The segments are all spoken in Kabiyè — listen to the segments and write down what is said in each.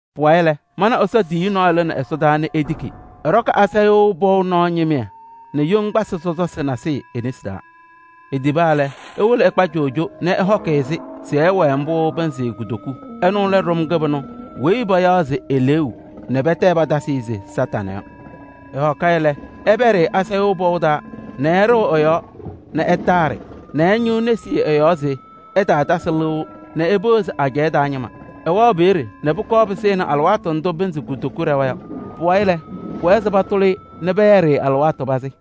Pʋwayɩ lɛ, mana Ɛsɔ tiyiyu nɔɔyʋ lɩnɩ ɛsɔdaa nɛ etiki. Ɛɖɔkɩ asayʋʋ pɔʋ nɔɔ ñɩmɩyɛ nɛ yoŋgbasɩ sɔsɔsɩ nasɩyɩ e-nesi taa. Etiba lɛ, ewolo ɛkpa coojo nɛ ɛhɔkɩ-ɩ-sɩ se ɛwɛɛ mbʋ pɩnzɩ kutoku. Ɛnʋ lɛ ɖʋm kɩbɩnʋ weyi payaɣ se eleeu nɛ pɛtɛ patasɩ-ɩ se Kañadʋ Satanɩ yɔ. Ɛhɔkɩ-ɩ lɛ, ɛpɛɖɩ-ɩ asayʋʋ pɔʋ taa nɛ ɛɖɩɣ ɛ-yɔɔ nɛ ɛtaaɖɩ nɛ ɛñɩɣ nesi ɛ-yɔɔ se ɛtaatasɩ lɩʋ nɛ epeɣzi ajɛɛ taa ñɩma. Ɛwɛɣ peeye nɛ pʋkɔɔ pɩsɩnɩ alɩwaatʋ ndʋ pɩnzɩ kutoku ɖɛwa yɔ. Pʋwayɩ lɛ, pʋwɛɛ se patʋlɩ-ɩ nɛ pɛyɛɖɩ-ɩ alɩwaatʋ pazɩ.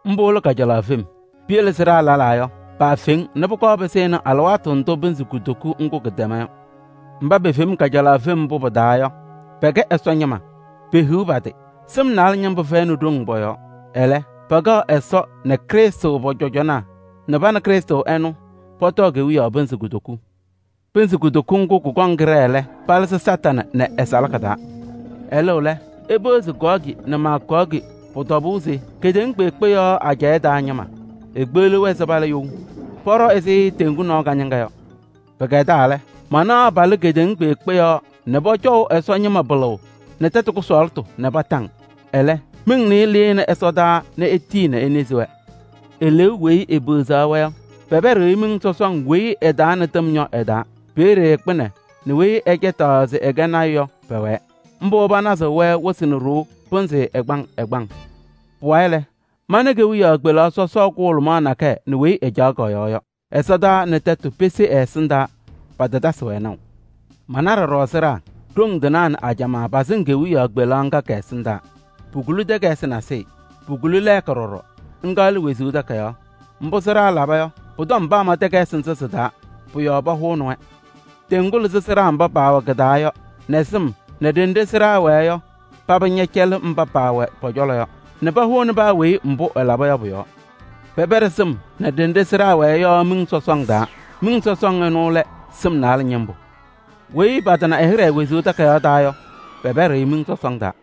Mbʋ lɛ kajalaɣ fem. Piyele sɩɖaa lɛlaa yɔ, paafeŋ nɛ pʋkɔɔ pɩsɩnɩ alɩwaatʋ ndʋ pɩnzɩ kutoku ŋgʋ kɩtɛma yɔ. Mba pefeŋ kajalaɣ fem mbʋ pɩ-taa yɔ, pɛkɛ Ɛsɔ ñɩma, pehiɣ pa-tɩ! Sɩm naalɛ ñɩmbʋ fɛyɩnɩ ɖoŋ pɔ-yɔɔ. Ɛlɛ, pɛkɛɣ Ɛsɔ nɛ Krɩstʋ pɔ-cɔjɔnaa nɛ pa nɛ Krɩstʋ ɛnʋ, pɔtɔɔ kewiyaɣ pɩnzɩ kutoku. Pɩnzɩ kutoku ŋgʋ kʋkɔŋ kɩɖɛɛ lɛ, palɩzɩ Kañadʋ Satanɩ nɛ ɛ-salaka taa. Ɛlɩɣ lɛ, epeɣzi Gɔɔgɩ nɛ Maagɔɔgɩ, pʋ-tɔbʋʋ se kedeŋa kpeekpe yɔɔ ajɛɛ taa ñɩma. Ekpeɣliɣ-wɛ se pala you. Pɔɖɔ ɛzɩ teŋgu nɔɔ kañɩŋa yɔ. Pɩkɛdaa lɛ, manaɣ palɩ kedeŋa kpeekpe yɔɔ nɛ pɔcɔʋ Ɛsɔ ñɩma pɩlʋʋ nɛ tɛtʋ kʋsɔɔlɩtʋ kondiko. Ɛlɛ, miŋ nɩɩyɩ lɩnɩ ɛsɔdaa nɛ etii enezi-wɛ. Eleeu weyi epeɣzaɣ-wɛ yɔ, pɛpɛɖɩ-ɩ miŋ sɔsɔŋ weyi ɛ-taa nɛ tɩm yɔ ɛ-taa. Peeye kpɩnɛ nɛ weyi ɛcɛtɩɣ se ɛkɛ lɔɔyaɣ tʋ yɔ, pɛwɛɛ. Mbʋ panazɩɣ-wɛ wɩsɩ nɛ ɖoo pɩnzɩ ɛgbaŋ ɛgbaŋ. Pʋwayɩ lɛ, mana kewiyaɣ kpelaɣ sɔsɔɔ kʋhʋlʋmaɣ nakɛyɛ nɛ weyi ɛcaɣ kɔ-yɔɔ yɔ. Ɛsɔtɔnʋʋ nɛ tɛtʋ pese ɛ-ɛsɩndaa, patatasɩ-wɛ naʋ. Mana ɖɔɖɔ sɩɖaa: ɖoŋ tɩnaa nɛ ajamaa pasɩŋ kewiyaɣ kpelaɣ ŋga kɛ-ɛsɩndaa. Pukuli takayɩsɩ nasɩyɩ. Pukuli lɛɛka ɖɔɖɔ, ŋga lɛ wezuu takayaɣ. Mbʋ sɩɖaa laba yɔ, pʋ-tɔm paama takayɩsɩ nzɩ sɩ-taa, pʋ-yɔɔ pahʋnɩ-wɛ. Teŋgu lɩzɩ sɩɖaa mba paawɛ kɩ-taa yɔ nɛ sɩm nɛ ɖenɖe sɩɖaa wɛɛ yɔ, paba ñɛcɛlɩ mba paawɛ pɔ-cɔlɔ yɔ nɛ pahʋnɩ paa weyi mbʋ ɛlaba yɔ pʋ-yɔɔ. Pɛpɛɖɩ sɩm nɛ ɖenɖe sɩɖaa wɛɛ yɔ miŋ sɔsɔŋ taa. Miŋ sɔsɔŋ ɛnʋ lɛ: sɩm naalɛ ñɩmbʋ. Weyi patana ɛ-hɩɖɛ wezuu takayaɣ taa yɔ, pɛpɛɖɩ-ɩ miŋ sɔsɔŋ taa.